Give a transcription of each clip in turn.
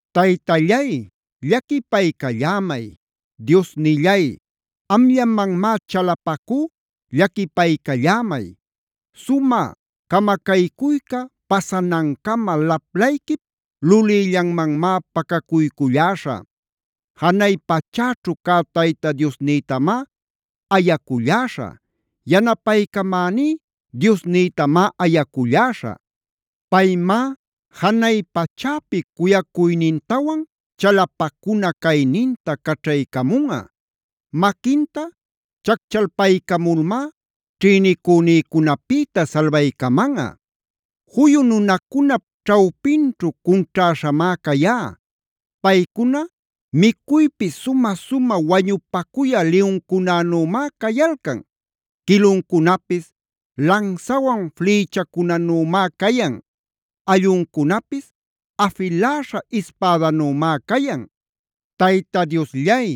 Taytallay, llaquipaycallämay. Diosnillay, amllamanmá chalapacú, llaquipaycallämay. Sumä camacaycuyca pasanancama laplayquip lulïllanmanmá pacacuyculläśhä. Janay pachäćhu cä Tayta Diosnïtamá ayaculläśhä. Yanapaycamäní Diosnïtamá ayaculläśhä. Paymá janay pachäpi cuyacuynintawan chalapacuna cayninta caćhaycamunꞌa. Maquinta chacchalpaycamulmá ćhïnicünïcunapïta salbaycamanꞌa. Juyu nunacunap ćhawpinćhu cunćhäśhämá cayá. Paycuna micuypi sumä-sumä wañupacuyä liyuncunänümá cayalcan. Quiluncunapis lansawan flïchacunanümá cayan. Alluncunapis afiläśha ispädanümá cayan. Tayta Diosllay,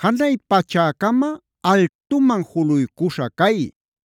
¡janay pachäcama altuman juluycuśha cay!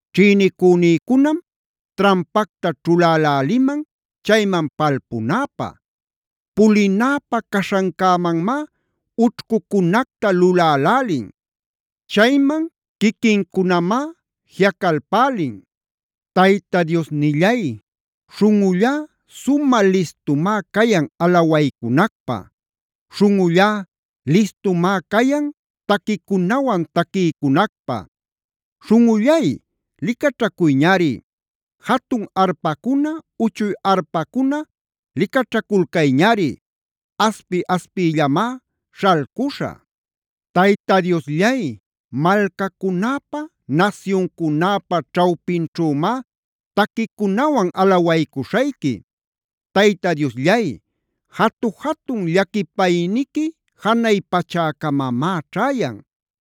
Ćhïnicünïcunam trampacta ćhuläläliman chayman palpunäpä. Pulinäpä caśhancämanmá ućhcucunacta lulälälin. Chayman quiquincunamá jiꞌacalpälin. Tayta Diosnillay, śhunꞌullá sumä listumá cayan alawaycunacpä. Śhunꞌullá listumá cayan taquicunawan taquiycunacpä. ¡Śhunꞌullay, licaćhacuyñari! ¡Jatun arpacuna, uchuy arpacuna licaćhaculcayñari! ¡Aspi-aspiyllamá śhalcuśhä! Tayta Diosllay, malcacunäpa nasyuncunäpa ćhawpinćhümá taquicunawan alawaycuśhayqui. Tayta Diosllay, jatu-jatun llaquipayniqui janay pachäcamamá ćhäyan.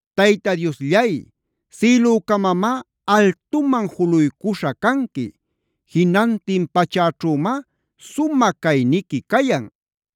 Tayta Diosllay, ¡sïlücamamá altuman juluycuśha canqui! ¡Jinantin pachäćhümá sumä cayniqui cayan!